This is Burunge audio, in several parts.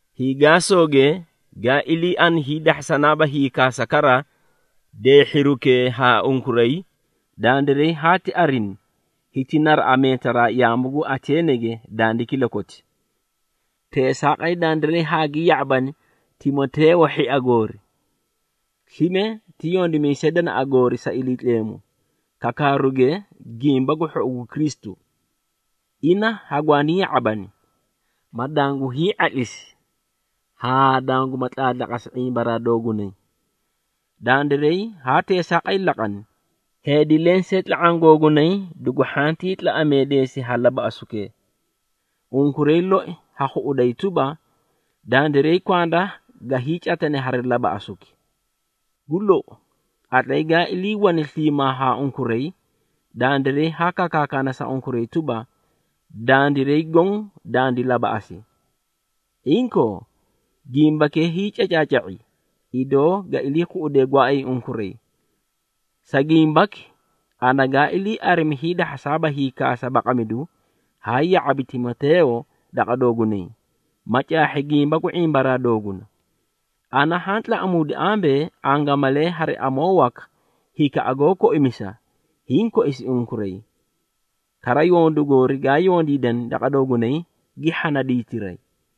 Hiigaasooge, gaa iliiani hiidahhasanaaba hiikaasa kara deehhirukee haa unkuray, dandiray haati arini, hiti naraꞌa meetaraa yaamu gu Ateenege dandi kilakoti. Teesaaqay, dandiray haagi ya⁄abani Timoteeyo hhia goorii, slime ti yondimiisay danaꞌa goori sa Iliitleemu, kakaruge Gimba gu Hhou gu Kristu. Ina hagwaani ya⁄abani, ma dangu hii⁄atlisi haa danguma tlaatlaqasi ⁄imbaraa doogunay. Dandiray haa teesaaqay laqani, heedi lensee tla⁄aã googunay dugu hhantii tlaꞌameedeesi ha labaꞌasukee. Unkuray loi ha khuꞌuday tuba, dandiray kwanda ga hiicatane hari labaꞌasuki. Gu lou, qatlay gaa iliiwane sliimaa haa unkuray, dandiray haa kakaakana sa unkuray tuba, dandiray goõ dandi labaꞌasi. Inkoo, gimbakee hiicacaaca⁄i, idoo ga ilii khuꞌudee gooay unkuray. Sa gimbaki, ana gaa ilii arimi hiidahhasaaba hiikasa baqamidu, haa ya⁄abi Timoteeyo daqa doogunay, ma caahhi gimba gu ⁄imbaraa dooguna. Ana haa tlaꞌamuudi ambee, angamalee hari amoo waka hikaꞌa goó koimisa, hiĩ koisi unkuray. Kara yondu goori gaa yondiidani daqa doogunay, gi hhana diitiray.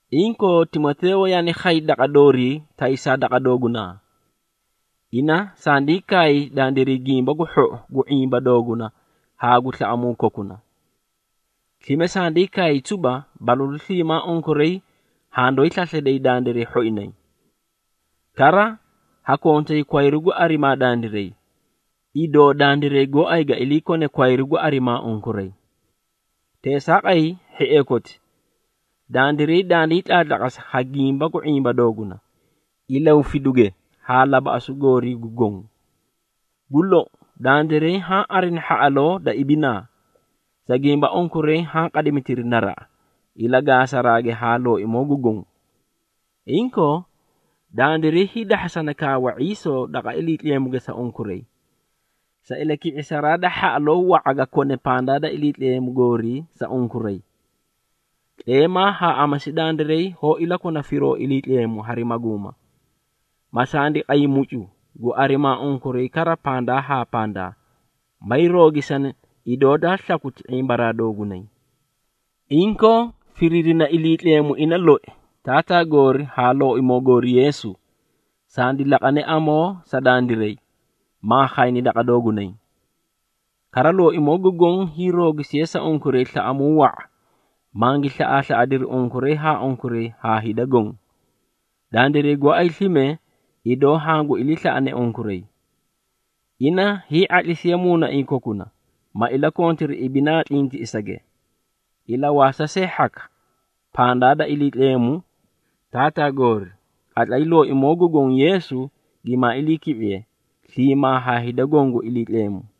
Inkoo, Timoteeyo yaani khay daqa doorii taysaa daqa doogunaa. Ina sandii kaay dandiray gimba gu hhou gu ⁄imba dooguna haa gu slaꞌamuu kokuna. Slime sandii kaay tuba, balalu sliimaa unkuray handooyi slaslayday dandiray hhoinay. Kara, ha kontay kwayru gu arimaa dandiray, idoo dandiray gooay ga ilii kone kwayru gu arimaa unkuray. Teesaaqay, hhiee koti, dandiray dandii tlaatlaqasi ha gimba gu ⁄imba dooguna, ilahufiduge haa labaꞌasu goorii goõ. Gu lou, dandiray haã arini hhaꞌaloo da ibinaa, sa gimba unkuray haã qadimitiri naraꞌa, ilagaasage haa Looimoo gu Goõ. Inkoo, dandiray hiidahhasa kaawa ⁄iisoo daqa Iliitleemuge sa unkuray, sa ilaki⁄isaraa da hhaꞌaloo wa⁄a ga kone pandaa da Iliitleemu goorii sa unkuray. Tleemaa haa amasi dandiray hoó ilakona firoo Iliitleemu hari maguuma, ma sandi qay mucu, gu arimaa unkuray kara pandaa haa pandaa, may roogisani idoo daa slakuti ⁄imbaraa doogunay. Inkoo, firiirina Iliitleemu ina loi, Taataa goori haa Looimoo goori Yeesu, sandi laqane amoo sa dandiray, maa khayni daqa doogunay. Kara, Looimoo gu Goõ hiiroogisiye sa unkuray slaꞌamuu wa⁄a, mangi slaꞌaaslaꞌadiri unkuray haa unkuray haa hida goõ. Dandiray gooay slime, idoo hangu iliislaꞌane unkuray. Ina hii⁄atlisiye muunaiĩ kokuna, ma ilakontiri ibinaa tlintiꞌisage, ilawaasa see hhaka pandaa da Iliitleemu Taataa goori, qatlay Looimoo gu Goõ Yeesu gimaa iliiki⁄iye, sliimaa haa hida goõ gu Iliitleemu.